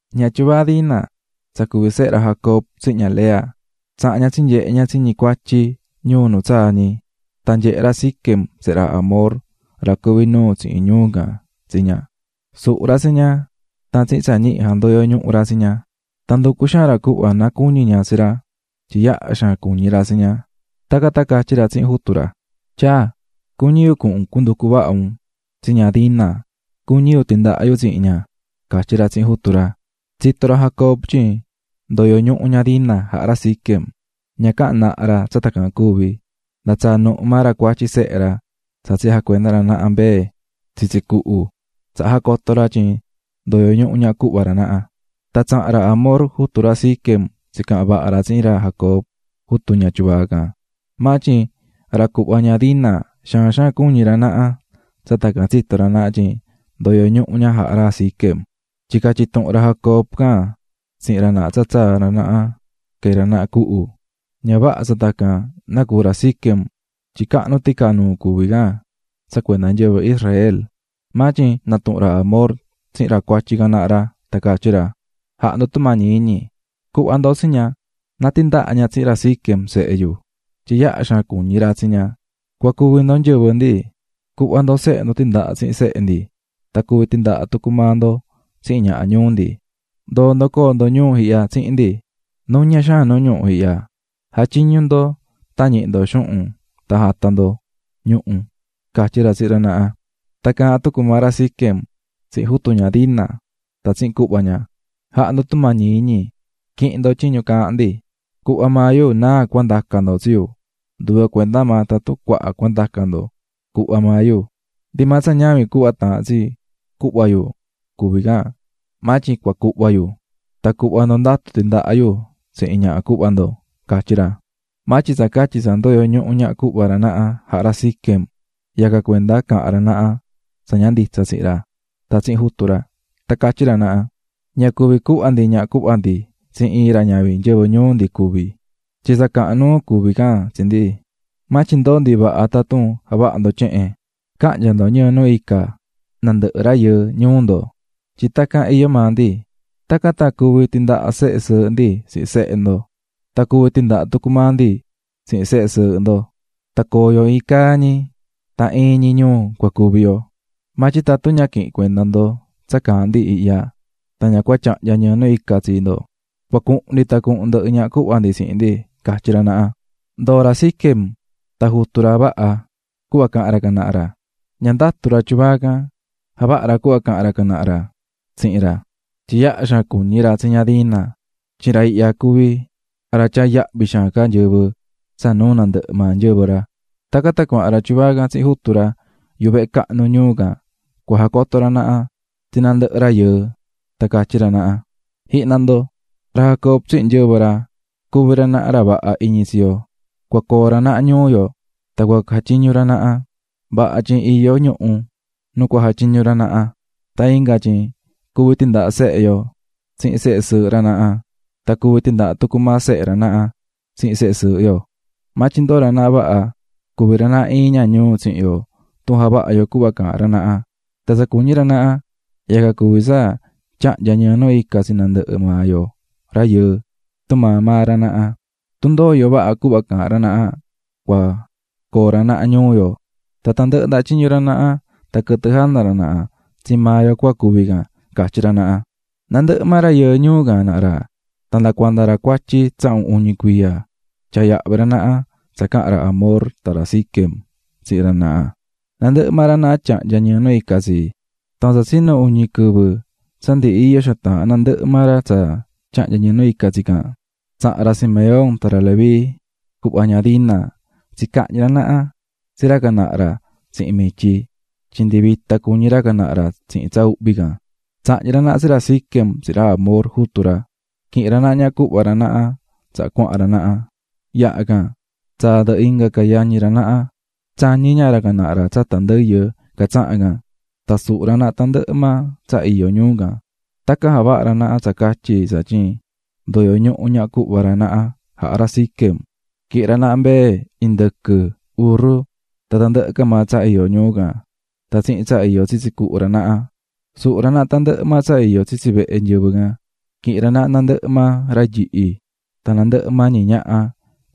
Ña tyuvaa Dina, tsa cuví sehe ra Jacob tsihin ña Lea, tsaha̱n ña tsinyehe̱ ña tsi ñi cuatyi ñuu nu tsaa̱ ñi. Tan nyehe̱ ra Siquem, sehe ra Hamor, ra cuví nuu tsihin ñuu can, tsi ña, suhu̱ ra tsi ña tan tsihin tsa ñihi jandoyo̱ ñuhu ra tsi ña. Tan nducu̱ xaan ra cuhva na cuñi ña tsi ra, tyin yaha xaan cuñí ra tsi ña. Tacan tan catyí ra tsihin jutu ra: --Tyaa, cuñí yu cuhun un cua nducu vaha un tsi ña Dina, cuñí yu tindaha yu tsihin ña --catyí ra tsihin jutu ra. Tsito̱ ra Jacob tyin ndoyo̱ ñuhu ña Dina jaha̱ ra Siquem, ña caha̱n naha ra tsa tacan cuvi̱, nda tsaa̱ nuhu maa ra cuatyi sehe ra tsa tsi jacuenda̱ ra naha mbee tsitsi cuhu tsaha jacoto̱ ra tyin ndoyo̱ ñuhu ñaha cuhva ra naha. Tan tsaha̱n ra Hamor, jutu ra Siquem, tsicaha̱n vaha ra tsihin ra Jacob, jutu ña tyuvaa can. Maa tyin ra cuhva ña Dina xaan xaan cuñí ra naha tsa tacan tsito̱ ra naha tyin ndoyo̱ ñuhu ña jaha̱ ra Siquem, tyin catyi̱ tuhun ra Jacob can tsihin ra naha tsa tsaa̱ ra naha quee̱ ra naha cuhu, ña vaha tsa tacan nacuu̱ ra Siquem tyin cahnu ticanuu cuví can tsa cuenda nyɨvɨ ra naha. Maa tyin natuhu̱n ra Hamor tsihin ra cuatyi can naha ra, tan catyí ra: --Ja̱ha ndo tumañi iñi, cu̱hva ndo tsi ña na tindaha ña tsihin ra Siquem, sehe yu, tyin yaha xaan cuñí ra tsi ña. Cua cuvi ndo nyɨvɨ ndi, cu̱hva ndo sehe ndo tindaha tsihin sehe ndi tan cuví tindaha tucu maa ndo tsihin ñaha ñuu ndi. Ndo̱o ndo coo ndo ñuu ihya tsihin ndi nuña xaan nu ñuhu ihya, ja̱tyiñu ndo tan ñihi ndo xuhun tan ja̱ta ndo ñuhu --catyí ra tsihin ra naha. Tan caahán tucu maa ra Siquem tsihin jutu ña Dina tan tsihin cuhva ña: --Ja̱ha ndo tumañi qui̱hin ndo tyiñu caahán ndi. Cuhva maa yu náa cua ndacan ndo tsi yu. Nduve cuenda maa tatun cuaha cua ndacan ndo, cuhva maa yu, ndi maa tsa ñavin cuhva taahán tsi cuhva yu cuví can maa tyin cua cuhva yu. Tan cuhva ndo ndatu tindaha yu tsihin ñaha cuhva ndo --catyí ra. Maa tyin tsa catyi tsa ndoyo̱ ñuhu ñaha cuhva ra naha jaha̱ ra Siquem, yacan cuenda caha̱n ra naha tsa ña nditsa tsihin ra tan tsihin jutu ra. Tan catyí ra naha: --Ña cuví cuhva ndi ñaha cuhva ndi tsi iin ra ñavin nyɨvɨ ñuu ndi cuví, tyin tsa cahan nuu cuví can tsi ndi. Maa tyin ndoo ndi vaha tatun javaha ndo tyehen: ca̱hnya ndo ñɨɨ nu ica nandɨhɨ rayɨɨ ñuu ndo tyin tacan iyó maa ndi. Tacan tan cuvi tindaha sehe sɨɨhɨ ndi tsihin sehe ndo, tan cuvi tindaha tucu maa ndi tsihin sehe sɨɨhɨ ndo; tan coo yo iin caa ñi tan iin ñi ñuu cua cuvi yo. Maa tyin tatun ña quihin cuenda ndo tsa caahán ndi ihya, tan ña cua tyahnya ñɨɨ nu ica tsi ndo, cua cuhun ndi tan cuhun ndɨhɨ ñaha cuhva ndi tsihin ndi --catyí ra naha. Ndoo̱ ra Siquem tan jutu ra vaha cuhva caha̱n ra can naha ra. Ña ndatu ra tyuvaa can, javaha̱ ra cuhva caha̱n ra can naha ra tsihin ra, tyin yaha xaan cuñí ra tsi ña Dina. Tyin ra ihya cuví ra tyaá yahvi xaan ca nyɨvɨ tsa nuu nandɨhɨ maa nyɨvɨ ra. Tacan tan cuahan ra tyuvaa can tsihin jutu ra yuhu vehe cahnu ñuu can cua jacoto ra naha tsi nandɨhɨ rayɨɨ tan catyí ra naha: --Ji̱hna ndo, ra Jacob tsihin nyɨvɨ ra, cuví ra naha ra vaha iñi tsi yo, cua coo ra naha ñuu yo tan cua jatyiñu ra naha, vaha tyin iyó ñuhu nu cua jatyiñu ra naha; tan inga tyin cuvi tindaha sehe yo tsihin sehe sɨɨhɨ ra naha tan cuvi tindaha tucu maa sehe ra naha tsihin sehe sɨɨhɨ yo. Maa tyin ndoo ra naha vaha cuvi ra naha iin ña ñuu tsihin yo tun javaha yo cuhva caahán ra naha, tan tsa cuñí ra naha, yacan cuví tsa tyahnya ñɨɨ nu ica tsi nandɨhɨ maa yoo rayɨɨ tumaa maa ra naha. Tun ndoo yo vaha cuhva caahán ra naha cua coo ra naha ñuu yo, tan tandɨhɨ ndaha tyiñu ra naha tan quɨtɨ jana ra naha tsii maa yo cua cuvi can ―catyí ra naha. Nandɨhɨ maa rayɨɨ ñuu can naha ra tan nda cuanda ra cuatyi tsahun uñi cuiya tyaa̱ yahvi ra naha tsa caha̱n ra Hamor tan ra Siquem, tsihin ra naha, nandɨhɨ maa ra naha tyahnya̱ ñɨɨ nu ica tsi. Tan tsa tsinu uñi quɨvɨ tsa ndi iyo xaan taahán nandɨhɨ maa ra tsa tyahnya̱ ñɨɨ nu ica tsi can, tsaha̱n ra Simeón tan ra Leví cuhva ña Dina tsicahñi̱ ra naha tsi ra can naha ra tsihin mityi tyin ndi vita cuñí ra can naha ra tsihin tsa uhvi can. Tsahñi̱ ra naha tsi ra Siquem tsihin ra Hamor, jutu ra, quihi̱n ra naha ñaha cuhva ra naha tsaha cuahan ra naha. Yaha can, tsaa̱ ndɨhɨ inga ca yañi ra naha, tsañí ña ra can naha tsata ndɨyɨ catsahán can, tan suhu̱ ra naha tandɨhɨ maa tsa iyó ñuu can. Tacan javaha̱ ra naha tsa catyi tsatyin ndoyo̱ ñuhu ñaha cuhva ra naha jaha̱ ra Siquem. Quihi̱n ra naha mbee, indɨquɨ, urru tan tandɨhɨ ca maa tsa iyó ñuu can tan tsihin tsa iyó tsitsi cuhu ra naha ra. Suhu̱ ra naha tandɨhɨ maa tsa iyó tsitsi vehe nyɨvɨ can, quihi̱n ra naha nandɨhɨ maa ra nyihi tan nandɨhɨ maa ñi ñaha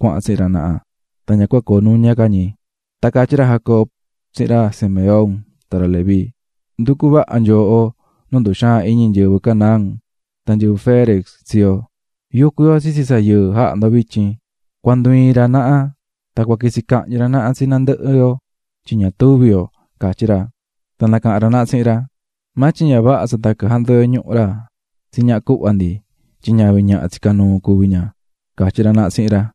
cuahan tsihin ra naha, tan ña cua coo nuña ca ñi. Tan catyí ra Jacob tsihin ra Simeón tan ra Leví: --Nducú vaha nyooho nu nduxaan iñi nyɨvɨ Canaán tan nyɨvɨ Ferez tsi yo, yucú yo tsitsi tsa yɨɨ jaha̱ ndo vityin. Cua ndu iin ra naha tan cua quitsi cahñi ra naha tsi nandɨhɨ yo tyin ña tuvi yo ―catyí ra. Tan nacaha̱n ra naha tsihin ra: --Maa tyin ña vaha tsa tacan jandoyo̱ ñuhu ra tsi ñaha cuhva ndi tyin ñavin ñaha tsicá nuu cuví ña ―catyí ra naha tsihin ra.